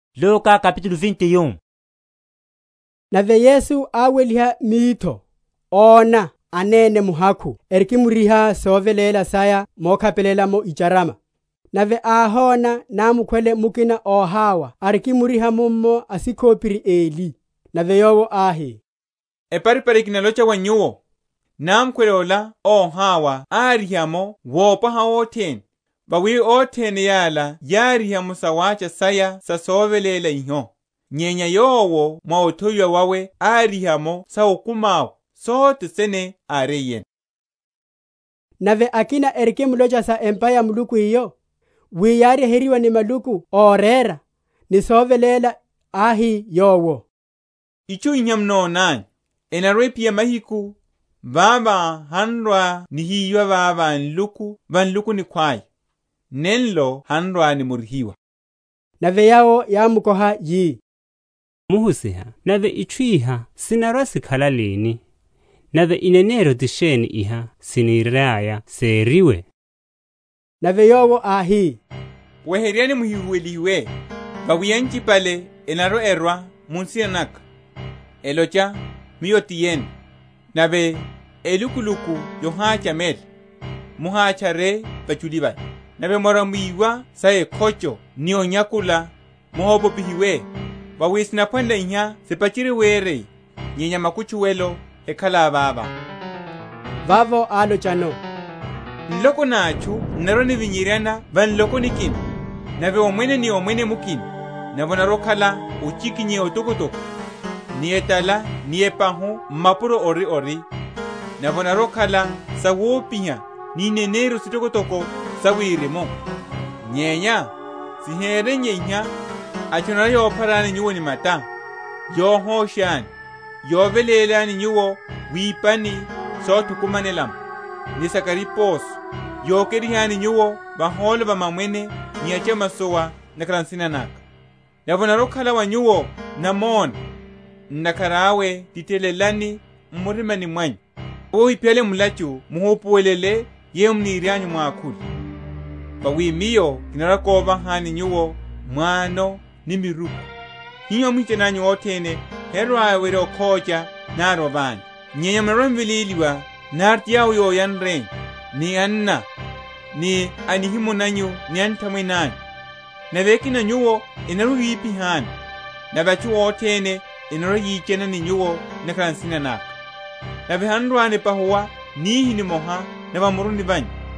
Yamahala ya námukhwele. Nave Yesu áweliha mitho, óna anene muhakhu erikimriha soveléla saya mokhapelela’mo icharama. Nave áhona námukhwele mukina óhawa arikimriha mummo asíkhopiri eli. Nave Yowo áhi, Eparipari kinalocha wa nyuwo, námukhwele ola óhawa áriha’mo wopwaha othene: vawi othene yala yáriha’mo sawácha saya sa soveléla iho; nyenya yowo mwa othowiwa wawe áriha’mo sa okumi awe, sothe sene áriyeno. Sohosha sa muhólo. Nave akina erikimlocha sa empa ya Muluku eyo, wi yáryeheryiwa ni maluku orera, ni soveléla, áhi Yowo, Itchu iha munonanyu, enarwa‐ephiya mahiku, vavo han’rwa‐nihiyiwa vava nluku va nluku nikhwaya, nenlo han’rwa‐nimorihiwa. Nave yawo yámukoha, yi, Muhusiha, nave itchu iha sinarwa‐sikhala lini? nave eneneryo ti sheni iha siniriaya seriwe? Nave Yowo áhi, Weheryani muhihuwelihiwe: vawi anchipale enarwa‐erwa mu nsina naka, elocha, Miyo ti yene; nave, Elukuluku yohachamela: muhatchare vachuli vaya. Nave mwarwa‐mwiwa sa ekhocho ni onyakula, muhopopihiwe; vawi sinaphwanela iha sipacherye wereya; nyenya makutchuwelo hekhala vavo. Vavo álochano, Nloko na atchu n’narwa‐nivinyerya va nloko nikina; nave omwene ni omwene mukina: nave onarwa‐okhala ochikinyeya otokotoko, ni etala ni epahu m’mapuro ori ori, nave onarwa‐okhala sawopiha ni ineneryo sitokotoko sa wirimu. Nyenya sihereiye iha, atchu enarwa‐yopharani nyuwo ni mata, yohoshani, yovelélani nyuwo wipani sothukumanela’mo, ni sa kariposo, yokerihani nyuwo vahólo va mamwene ni achamasowa, ntakhara a nsina naka. Nave onarwa‐okhala wa nyuwo namona. Ntakhara awe titelelani m’murimani mwanyu, wi ohiphiyale mulachu muhupuwelele yeyo munirianyu mwakhule. Vawi Miyo kinarwa‐kovahani nyuwo m’wano ni miruku, hiho amwichani anyu othene herwa‐ewerya okhócha nari oványa. Nyenya munarwa‐m’veléliwa nari ti yawo yoyanreni, ni anna, ni a nihimo nanyu ni anthamwene anyu; nave akina a nyuwo enarwa‐ewiphihani. Nave atchu othene enarwa‐yichana ni nyuwo ntakhara a nsina naka. Nave han’rwa‐nipahuwa nihi nimoha na va muruni vanyu.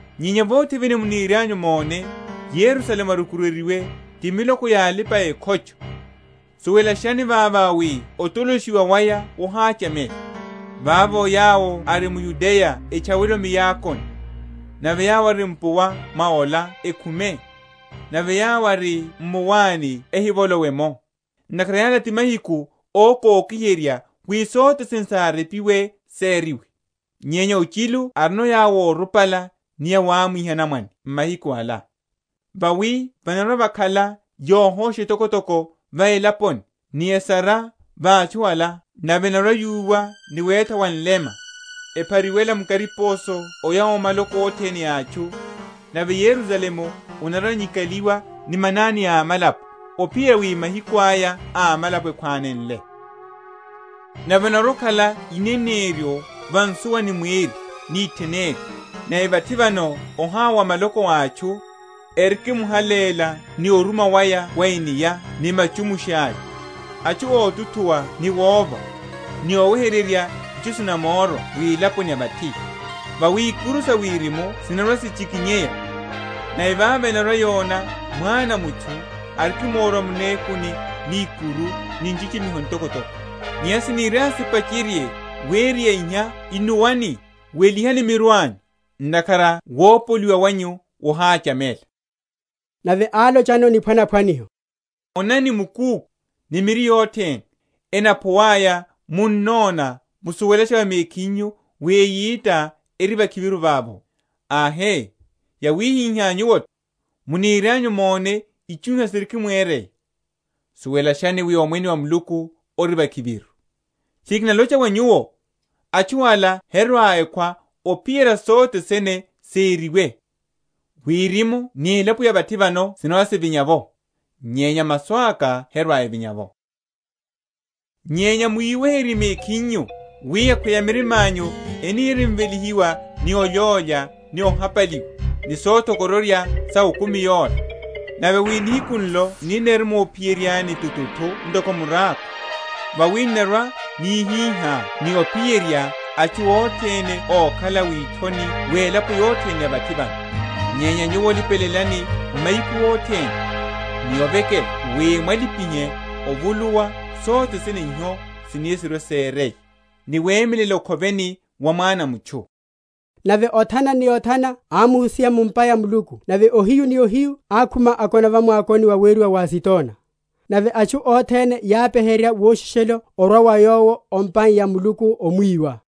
Nyenya vothe vene munirianyu mone Yerusalemu arukuryeryiwe ti miloko ya alipa‐ekhocho, suwelashani vavo wi otoloshiwa waya wohachamela. Vavo yawo ari m’Yudeya etchawele o miakoni, nave yawo ari mpuwa mwa ola ekhume, nave yawo ari m’mawani ehivolowe’mo. Ntakhara yala ti mahiku ókokiherya, wi sothe sene sárepiwe seriwe. Nyenya ochilu arino yawo órupala, ni awamwiha anamwane mahiku ala! vawi vanarwa‐vakhala yohosha etokotoko va elaponi, ni esara va atchu ala. Nave enarwa‐yuwa ni wétha wa nlema; ephariwela mu kariposo oya o maloko othene a atchu; nave Yerusalemu anarwa‐anyikaliwa ni manani a amalapo, ophiyerya wi mahiku aya a amalapo ekhwanenle. Orwa wawe wa Mwana a mutchu. Nave onarwa‐okhala ineneryo va nsuwa ni mweri ni itheneri; nave vathi vano ohawa wa maloko a atchu, erikimuhalela ni oruma waya wa enia ni machumusha’ya; atchu ótuthuwa ni wova, ni oweheryerya itchu sinamórwa wilaponi ya vathi: vawi ikuru sa wirimu sinarwa‐sichikinyeya. Nave vavo enarwa‐yona Mwana a mutchu arikimórwa mu nekuni ni ikuru ni nchichimiho ntokotoko. Nyenya siniriaya sipacherye wereya iha innuwani, welihani miru anyu; ntakhara wopoliwa wanyu wohachamela. Nave álochano niphwanaphwaniho; Onani mukúkhu, ni miri yothene: enaphuwaya, munnona musuwelasha va mekhinyu wi eyita eri vakhiviru vavo. Ahe, yawihihá nyuwo’tho, munirianyu mone itchu iha sirikimwereya, suwelashani wi Omwene wa Muluku ori vakhiviru. Tchiri kinalocha wa nyuwo, Atchu ala herwa‐ekhwa, ophiyerya sothe sene seriwe. Wirimu ni elapo ya vathi vano sinarwa‐sivinya’vo; nyenya masu aka herwa‐evinya’vo. Sa olipelela. Nyenya mwiweherye mekhinyu, wi akhweya mirima’nyu enirimvelihiwa ni olyólya ni ohapaliwa, ni sothokororya sa okumi yola, nave wi nihiku nlo n’nirimophiyeryani tuthu ntoko murákho: vawi n’narwa‐nihihá ni ophiyerya atchu othene ókhala withoni welapo yothene ya vathi vano. Nyenya nyuwo lipelelani mahiku othene, ni ovekela wi mwalipihe ovuluwa sothene iho sini sirwe‐sereye, ni wemelela okhoveni wa Mwana a mutchu. Nave othana ni othana ámuhusiha mu’mpa ya Muluku; nave ohiyu ni ohiyu ákhuma, akona va mwakoni waweriwa wa Azitona. Nave atchu othene yápeherya woshishelo orwa wa Yowo o’mpa ya Muluku omwiwa.